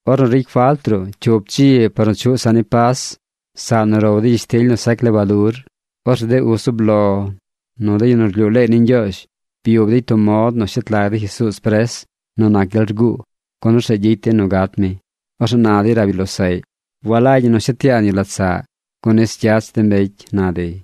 Ornu ricy falt ruꞌ cyup dzi par nu chuꞌ saꞌ ni Pas, saꞌ nu row dey gyishtily nu sac lebadur, orzeꞌ de uz zub lo nu de yu nu rlyuu leey ni Ñgyoozh byub dey tub mod nu shet lag dey Jesuuz pres nu nac gyel rguu, gun orzeꞌ gyicy dey nu gat mi. Orzeꞌ na dey rab yu losaꞌy: ―Walagy ñi nu shet yaan yu lat saꞌ, gun nis gyach de mbecy ―na dey.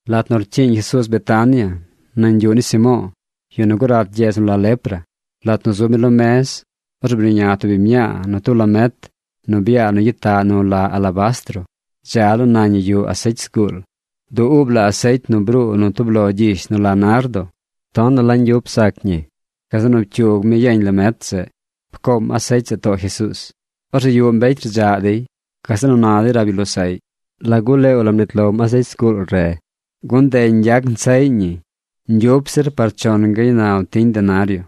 Lat nu rcyiiñ Jesuuz Betania nañ yuꞌ ni Simo̱o̱, yu nu gurat gyedz nu la lepra, lat nu zub mi lo mez, orzeꞌ bruꞌña tub biñ mñaa nu tub lamet nu byaa nu gyitaꞌ nu la alabastro. Dza laa nañ ñi yuꞌ asecy zguul. Du uub la asecy nu bruu nu tub lo gyish nu la nardo. Tonaꞌ la ñgyup sac ñi. Gazeꞌ nu pcyug mi yeñ lamet zeꞌ. Pcoom asecy zeꞌ too Jesuuz. Orzeꞌ yuꞌ mbecy rdzaꞌ dey. Gazeꞌ nu na dey rab yu losaꞌy: ―¿Lagu leew la mnit lom asecy zguul re? Gun nde ñgyac nsaꞌy ñi ñgyup zir par chon gaaynal tiñ denario.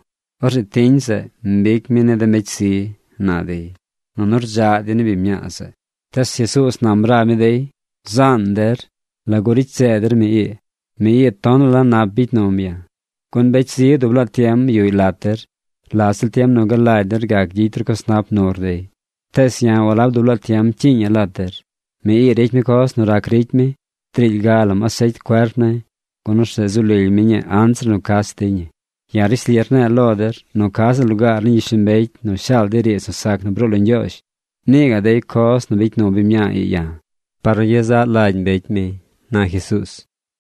Orzeꞌ tiñ zeꞌ mbic mi ni de mbecy zi ―na dey. Nunu rdzaꞌ dey ni biñ mñaa zeꞌ. Tees Jesuuz nam rab mi dey: ―Zaan der. ¿Lagu ricy seed der mi? Mi ii tonaꞌ la nap bicy num ya̱. Gun mbecy zi dub laa tiem yuꞌy lat der. La ziꞌl tiem nu galagy der gac gyicy ru coz nap nur dey. Tees ya̱ walab dub laa tiem cyiiña̱ lat der. Mi ii ricy mi coz nu rac ricy mi. Driily ga lam asecy cuerp ne̱ gun orzeꞌ zu lily mi ñii anzir nu cach dey ñi. Ya̱ rishli rne̱e̱ lo der nu ca ziꞌl lugaar ni gyishlombecy nu shaal dey riidz nu sac nu bruu lo Ñgyoozh, nii gaꞌ dey coz nu bicy nu biñ mñaa ii ya̱ par nu gyezaꞌ lagy mbecy mi ―na Jesuuz.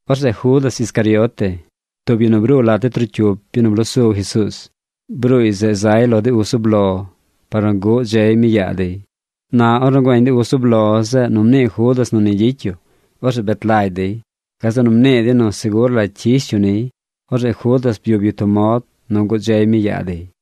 Orzeꞌ Judas Iscariote, tub yu nu bruu lat de trocyup yu nu bloo su Jesuuz, bruuy zeꞌ zay lo de uz zub lo par nu guꞌ dzey mi yaa dey. Na ornu güeñ de uz zub lo zeꞌ nu mnii Judas nu ni gyicy yu, orzeꞌ bet lagy dey. Gazeꞌ nu mnii dey nu segur la cyish yu niy. Orzeꞌ Judas byub yu mod nu guꞌ dzey mi yaa dey.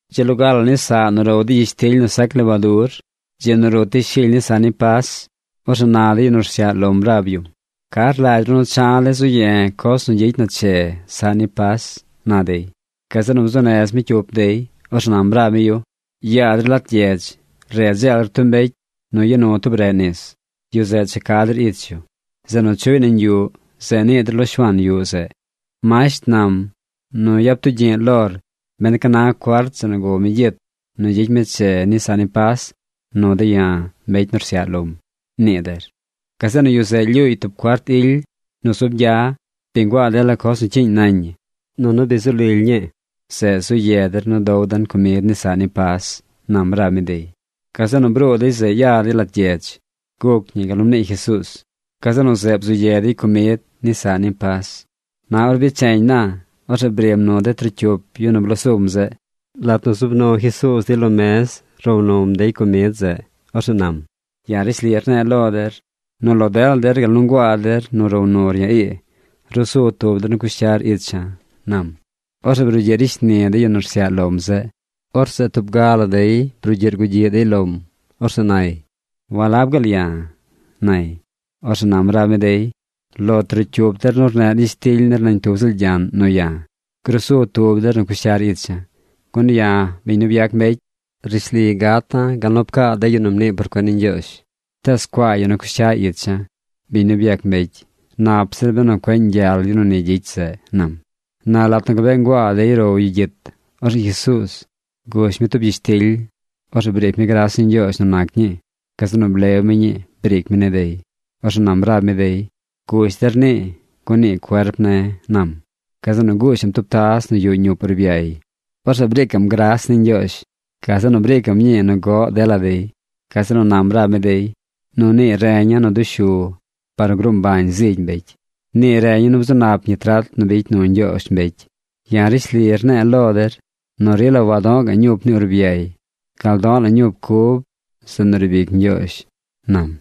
Dzi loga la ni saꞌ nu row dey gyishtily nu sac lebadur, dzi nu rut dey shily ni saꞌ ni Pas, orzeꞌ na de yu nu rsyaꞌ lom rab yum: ―¿Ca rlagy ru nu cha̱ de̱ zu ye̱ coz nu gyicy na che saꞌ ni Pas? ―na dey. Gazeꞌ nu bzuu nez mi cyup dey. Orzeꞌ nam rab mi yu: ―Yaa der lat gyedz. Re dzeel der tub mbecy nu ya nu tub reꞌ nis. Yu zeꞌ cha ca der ich yu. Zeꞌ nu chuꞌy nañ yuꞌ, zeꞌ nii der lo shuaan yuꞌ zeꞌ: “Masht nam nu yap tugyi̱ꞌ lor ben ca na cuart zeꞌ nu gow mi gyit nu gyicy mi che ni saꞌ ni Pas nu de̱ ya̱, mbecy nu rsyaꞌ lom”, nii der. Gazeꞌ nu yu zeꞌ lyuuy tub cuart ily nu zub gya. Bi nguaa dela coz nu cyiiñ nañ ñi nunu bi zu lily ñii. Zeꞌ zu ye der nu dow den comid ni saꞌ ni Pas ―nam rab mi dey. Gazeꞌ nu bruu dey zeꞌ ya dey lat gyedz. Guc ñi gal nu mnii Jesuuz. Gazeꞌ nu zeꞌ bzu ye dey comid ni saꞌ ni Pas. Na ornu becheñ na, orzeꞌ brim nu de trocyup yu nu bloo sum zeꞌ. Lat nu zub nu Jesuuz dey lo mez row num dey comid zeꞌ, orzeꞌ nam: ―Ya̱ rishli rne̱e̱ lo der nu lo dela der gal nu nguaa der nu row nur ya̱ ii, rusu tub der nu cush cyar icha̱ ―nam. Orzeꞌ brugyiꞌ ricy shni de yu nu rsyaꞌ lom zeꞌ. Orzeꞌ tub ga la dey brugyiꞌ rgugyiꞌ dey lom. Orzeꞌ nay: ―¿Walab gaal ya̱? ―nay. Orzeꞌ nam rab mi dey: ―Lo trocyup der nu rneꞌr gyishtily nir nañ tub ziꞌl gyaꞌn nu ya̱, grusu tub der nu cush cyar icha̱. Gun ya̱, biñ nu byac mbecy, rishli gata̱ gal nu pcaa de yu nu mnii por cuen ni Ñgyoozh. ¡Tees cuaa yu nu cush cya ich ya̱, biñ nu byac mbecy! Nap zir benu cueꞌ ñgyal yu nu ni gyicy zeꞌ ―nam. Na lat nu gabee nguaa dey row yu gyit, orzeꞌ Jesuuz gush mi tub gyishtily. Orzeꞌ briic mi gras ni Ñgyoozh nu nac ñii. Gazeꞌ nu blew mi ñii briic mi ni dey. Orzeꞌ nam rab mi dey: ―Gush der nii, gun nii cuerp ne̱ ―nam. Gazeꞌ nu gushaꞌm tub taz nu yuꞌ ñup urbyay. Orzeꞌ briicaꞌm gras ni Ñgyoozh. Gazeꞌ nu briicaꞌm ñi nu goꞌ dela dey. Gazeꞌ nu nam rab mi dey: ―Nu nii reña̱ nu dushu par nu gruu mbañ zigy mbecy. Nii reña̱ nu bzu nap ñi trat nu bicy nu Ñgyoozh mbecy. Ya̱ rishli rne̱e̱ lo der nu rila wado̱ꞌ ga̱ꞌ ñup ni urbyay gal do̱ꞌ la̱ ñup cub zeꞌ nu riib ic Ñgyoozh ―nam.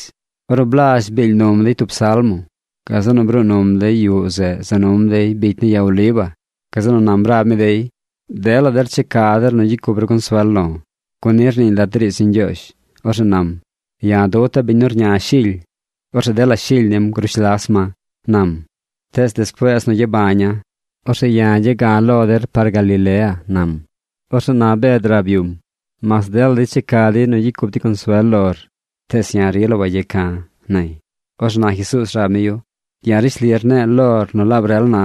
Ornu blazh biil num dey tub salmo, gazeꞌ nu bruu num dey yuꞌ zeꞌ za num dey bicy ni ya Oliva. Gazeꞌ nu nam rab mi dey: ―Dela der checa der nu gyicy cup ru consuel lo̱, gun ni rniiñ lat de riidz ni Ñgyoozh. Orzeꞌ nam: “Ya̱ duta̱ biñ nu rña shily. Orzeꞌ dela shily nim grush las ma”, nam. Tees despuees nu gyabaña̱, orzeꞌ ya̱ gya̱ ga̱ lo der par Galilea ―nam. Orzeꞌ na Bed rab yum: ―Mas dela dey checa dey nu gyicy cup dey consuel lor, tees ya̱ rila wayeca̱ ―nay. Orzeꞌ na Jesuuz rab mi yu: ―Ya̱ rishli rne̱e̱ lor nu laab rel na,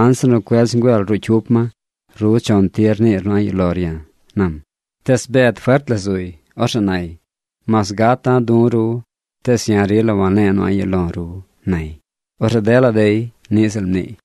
anzir nu cuedz ngüel ruꞌ cyup ma, ru chon tir niir nu a̱ꞌ yuꞌ lor ya̱ ―nam. Tees Bed fert la zuy. Orzeꞌ nay: ―Mas gata̱ du̱ ru, tees ya̱ rila wane̱e̱ nu a̱ꞌ yuꞌ lo̱ ru ―nay. Orzeꞌ dela dey niꞌ ziꞌl mniiy.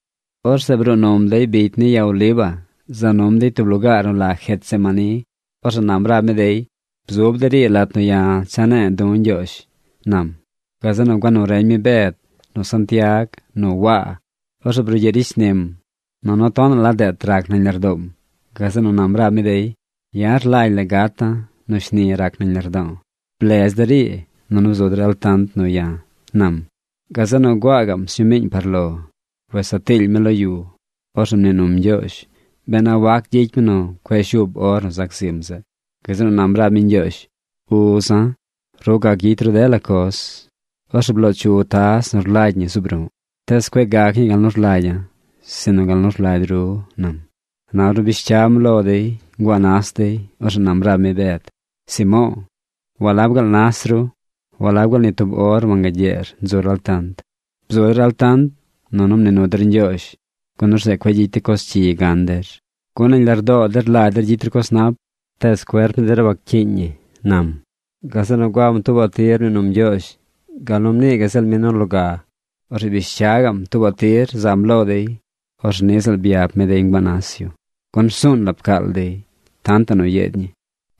Orzeꞌ bruu num dey bicy ni ya Oliva za num dey tub lugaar nu la Getsemaní. Orzeꞌ nam rab mi dey: ―Bzub der ii lat nu ya̱ cha ne̱e̱ du̱ Ñgyoozh ―nam. Gazeꞌ nu gua nu reñ mi Bed, nu Santiag, nu Waa. Orzeꞌ brugyiꞌ ricy shnim, nunu tonaꞌ la deet rac nañ lardoom. Gazeꞌ nu nam rab mi dey: ―Ya̱ rlagy la̱ gata̱ nu shni rac nañ lardo̱o̱. Blez der ii, nunu bzu der altant nu ya̱ ―nam. Gazeꞌ nu gua gaꞌm sñumiiñ par lo. Wes saa tiily mi lo yu. Orzeꞌ mnii num Ñgyoozh ben a wac gyicy mi nu cueꞌ shuub or nu zac zim zeꞌ. Gazeꞌ nu nam rab mi Ñgyoozh: ―Uza̱, ru gac gyicy ru dela coz. Orzeꞌ bloo chu taz nu rlagy ñi zuub ru̱ꞌ. Tees cueꞌ gac ñii gal nu rlagya̱, sinu gal nu rlagy ru ―nam. Na ornu bish cyam lo dey, nguaa nas dey. Orzeꞌ nam rab mi Bed: ―Simo̱o̱, ¿walab gaal nas ru? ¿Walab gaal ni tub or wangagyeer nzur altant? Bzu der altant nunu mnii nu der Ñgyoozh, gun orzeꞌ cueꞌ gyicy de coz cyi gan der. Gun nañ lardoo der rlagy der gyicy ru coz nap, tees cuerp ni der waccyiiñ ñi ―nam. Gazeꞌ nu guam tuubaꞌ tir mnii num Ñgyoozh gal nu mnii gaꞌ ziꞌl mi nu loga. Orzeꞌ bish cya gaꞌm tuubaꞌ tir zam lo dey. Orzeꞌ niꞌ ziꞌl byap mi dey nguaa nas yu, gun rsuun la pcaal dey tantaꞌ nu yeed ñi.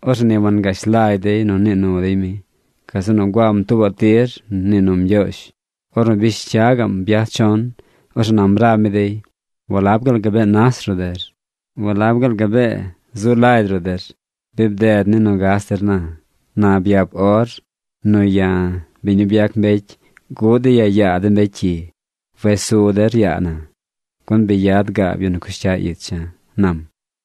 Orzeꞌ ni wangash lagy dey nu nii nu dey mi. Gazeꞌ nu guam tuubaꞌ tir mnii num Ñgyoozh. Ornu bish cya gaꞌm byaj chon, orzeꞌ nam rab mi dey: ―¿Walab gaal gabee nas ruꞌ der? ¿Walab gaal gabee zu lagy ruꞌ der? Bi bded ni nu gas der na. Na byap or nu ya̱, biñ nu byac mbecy guꞌ dey ya̱ yaa de mbecy cyi. Wes su der yaa na, gun bi yad gaab yu nu cush cya icha̱ ―nam.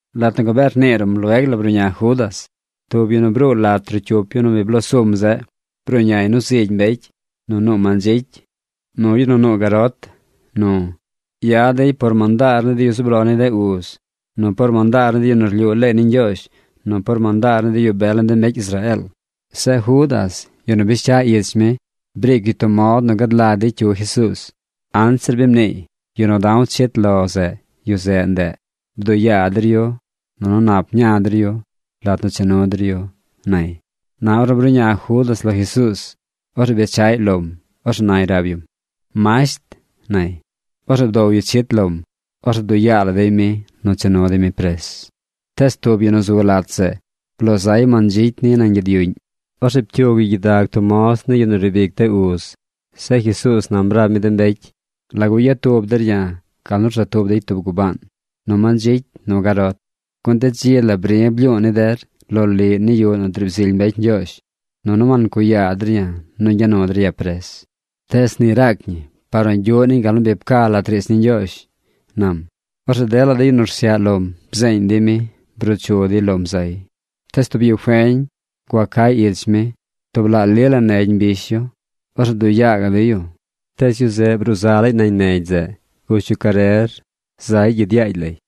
Lat nu gabee rnii ruꞌm lueg la bruꞌña Judas, tub yu nu bruu lat trocyup yu nu bi bloo sum zeꞌ. Bruꞌñay nu zigy mbecy, nu nuu mandzicy, nu yu nu nuu garot, nu. Yad dey par mandaar ni de yu zub lo ni de uz, nu par mandaar ni de yu nu rlyuu leey ni Ñgyoozh, nu par mandaar ni de yu bel ni de mbecy Israeel. Zeꞌ Judas, yu nu bish cya ich mi, briic yu tub mod nu gad lagy dey cyu Jesuuz. Anzir bi mniiy: “Yu nu da̱w chit lo zeꞌ, yu zeꞌ ndeꞌ. Bduꞌ yaa der yu nunu nap ña der yu lat nu cha nu der yu”, nay. Na ornu bruꞌña Judas lo Jesuuz, orzeꞌ bechaꞌy lom. Orzeꞌ nay rab yum: ―¡Masht! ―nay. Orzeꞌ bdow yu chit lom. Orzeꞌ bduꞌ la yaa dey mi nu cha nu dey mi pres. Tees tub yu nu zu lat zeꞌ bloo zay mandzicy niy nañ gyid yuꞌñ. Orzeꞌ pcyug yu gyidag tub moz ni yu nu riib ic de uz. Zeꞌ Jesuuz nam rab mi de mbecy: ―¿Lagu yad tub der ya̱ gal nu rza tub dey tub gubaan: nu mandzicy nu garot? Gun de dzi la bri̱ blyu̱u̱ ni der loliꞌ ni yuꞌ nu driib zily mbecy Ñgyoozh, nunu wancuꞌ yaa der ya̱ nu ñgya nu der ya̱ pres. Tees ni raac ñi par nu gyuꞌ niñ gal nu bi pca lat riidz ni Ñgyoozh ―nam. Orzeꞌ dela de yu nu rsyaꞌ lom bzeeñ dey mi, bruu chu dey lom zay. Tees tub yu feñ gua cay ich mi. Tub laꞌ li la negy mbish yu. Orzeꞌ bduꞌ yaa gaꞌ dey yu. Tees yu zeꞌ bruu za laay nañ negy zeꞌ gush yu carer zay gyid yaagy lay.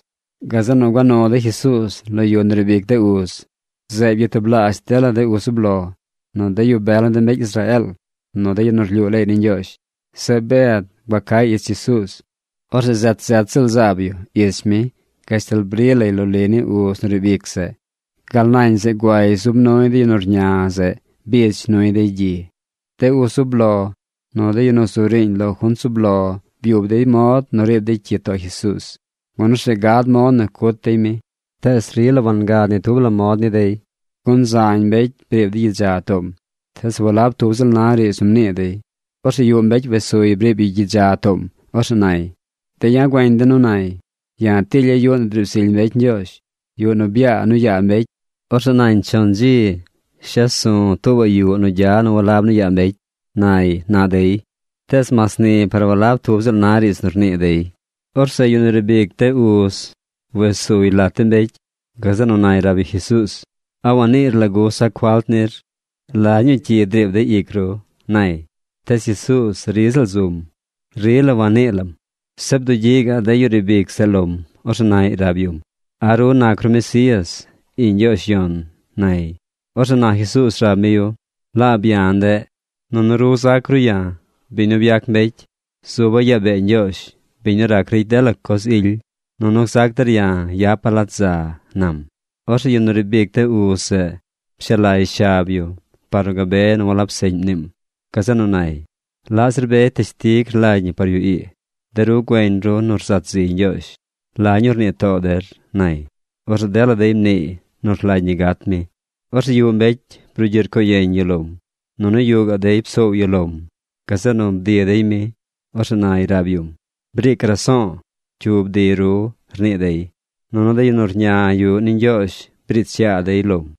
Gazeꞌ nu gua nu dey Jesuuz lo yu nu riib ic de uz. Zeꞌ byatublaazh dela de uz zub lo, nu de yu bel ni de mbecy Israeel, nu de yu nu rlyuu leey ni Ñgyoozh. Zeꞌ Bed gua cay ich Jesuuz. Orzeꞌ zet zet ziꞌl zaab yu ich mi gashtal bri lay loliꞌ ni uz nu riib ic zeꞌ. Gal nañ zeꞌ guay zub nuy de yu nu rña zeꞌ bidz nuy dey gyi. De uz zub lo, nu de yu nu zu riiñ lo junt zub lo byub dey mod nu riib dey cyi too Jesuuz, gun orzeꞌ gad mod nu cut dey mi, tees rila wangad ni tub la mod ni dey. Gun zañ mbecy briib dey gyidza toom. Tees walab tub ziꞌl na riidz nu mnii dey. Orzeꞌ yuꞌ mbecy wes suy briib yu gyidza toom. Orzeꞌ nay: ―De̱ ya̱ güeñ de̱ nu nay: “Ya̱ tilya̱ yuꞌ nu driib zily mbecy Ñgyoozh, yuꞌ nu byaa nu yaa mbecy. Orzeꞌ nañ chon dzi shes su̱ tuubaꞌ yuꞌ nu gya nu walab nu yaa mbecy”, nay ―na dey. Tees mas ni par walab tub ziꞌl na riidz nu rnii dey. Orzeꞌ yu nu riib ic de uz wes suy lat de mbecy. Gazeꞌ nu nay rab yu Jesuuz: ―¿A waniir lagu sac falt nir? ¿La ñuu cyi driib dey ic ru? ―nay. Tees Jesuuz ri ziꞌl zum. Rila wanii lam. Zeꞌ bdugyiꞌ gaꞌ yu riib ic zeꞌ lom. Orzeꞌ naꞌy rab yum: ―¿A ru nac ru Mesías, iꞌñ Ñgyoozh Yon? ―nay. Orzeꞌ na Jesuuz rab mi yu: ―Laab ya̱ ndeꞌ. Nunu ru zac ru ya̱, biñ nu byac mbecy, zuba̱ yaa bee Ñgyoozh, biñ nu rac ricy de lo la coz ily. Nunu gzac der ya̱ yapa̱ lat za ―nam. Orzeꞌ yu nu riib ic de uz zeꞌ pshaa lay shab yu par nu gabe nu walab seꞌñ mniim. Gazeꞌ nu nay: ―¿Laꞌ zir be teshtig rlagy ñi par yu ii? De ru güeñ ru nu rzat ziy Ñgyoozh. ¿La ñuu rnii too der? ―nay. Orzeꞌ dela dey mniiy nu rlagy ñi gat mi. Orzeꞌ yuꞌ mbecy brugyiꞌ rcoo yeñ yu lom. Nunu yuꞌ dey psoow yu lom. Gazeꞌ nu bdi dey mi. Orzeꞌ nay rab yum: ―¡Briic raso̱o̱! ¿Cyu bdi ru? ―rnii dey. Nunu de yu nu rña yuꞌ ni Ñgyoozh briich yaa dey lom.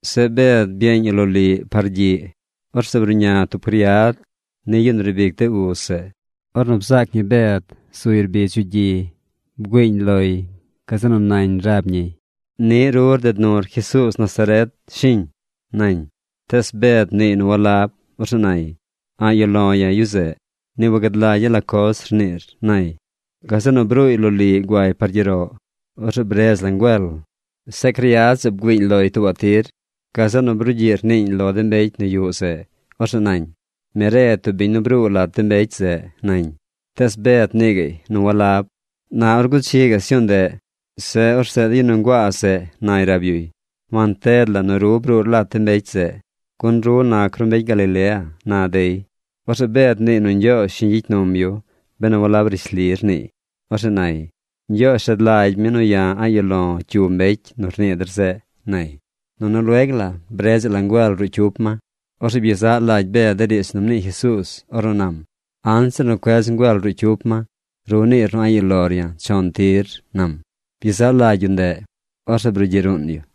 Zeꞌ Bed byeeñ yu loliꞌ par gyiꞌ. Orzeꞌ bruꞌña tub criad ni yu riib ic de uz zeꞌ. Ornu bzaac ñi Bed zuy rbidz yu gyi, bgüiiñ loy. Gazeꞌ nu nañ rab ñiy: ―Niꞌ ru rded nur Jesuuz Nazaret, ¿shiñ? ―nañ. Tees Bed mniiy nu walab. Orzeꞌ nay: ―A̱ꞌ yuꞌ lo̱ ya̱ yu zeꞌ. Ni wagad lagya̱ la coz rniir ―nay. Gazeꞌ nu bruuy loliꞌ guay par gyeroꞌ. Orzeꞌ bredz la ngüel. Zeꞌ criad zeꞌ bgüiiñ loy tuubaꞌ tir. Gazeꞌ nu brugyiꞌ rniiñ lo de mbecy nu yuꞌ zeꞌ. Orzeꞌ nañ: ―Mi re tub biñ nu bruu lat de mbecy zeꞌ ―nañ. Tees Bed mnii gaꞌy nu walab. Na or guchi gaꞌ sñuu ndeꞌ, zeꞌ, orzeꞌ de yu nu nguaa zeꞌ nay rab yuy: ―Wanted la nu ru bruur lat de mbecy zeꞌ, gun ru nac ru mbecy Galilea ―na dey. Orzeꞌ Bed mniiy nu Ñgyoozh shiñ gyicy num yu benu walab rishli rniiy. Orzeꞌ nay: ―¡Ñgyoozh rad lagy mi nu ya̱ a̱ꞌ yuꞌ lo̱ cyu mbecy nu rnii der zeꞌ! ―nay. Nunu lueg la bredzaꞌ la ngüel ruꞌ cyup ma. Orzeꞌ byezaꞌ la lagy Bed de riidz nu mnii Jesuuz ornu nam: “Anzir cuedz ngüel ruꞌ cyup ma, ru niir nu a̱ꞌ yuꞌ lor ya̱ chon tir”, nam. Byezaꞌ lagy yu ndeꞌ, orzeꞌ brugyiꞌ ruun yu.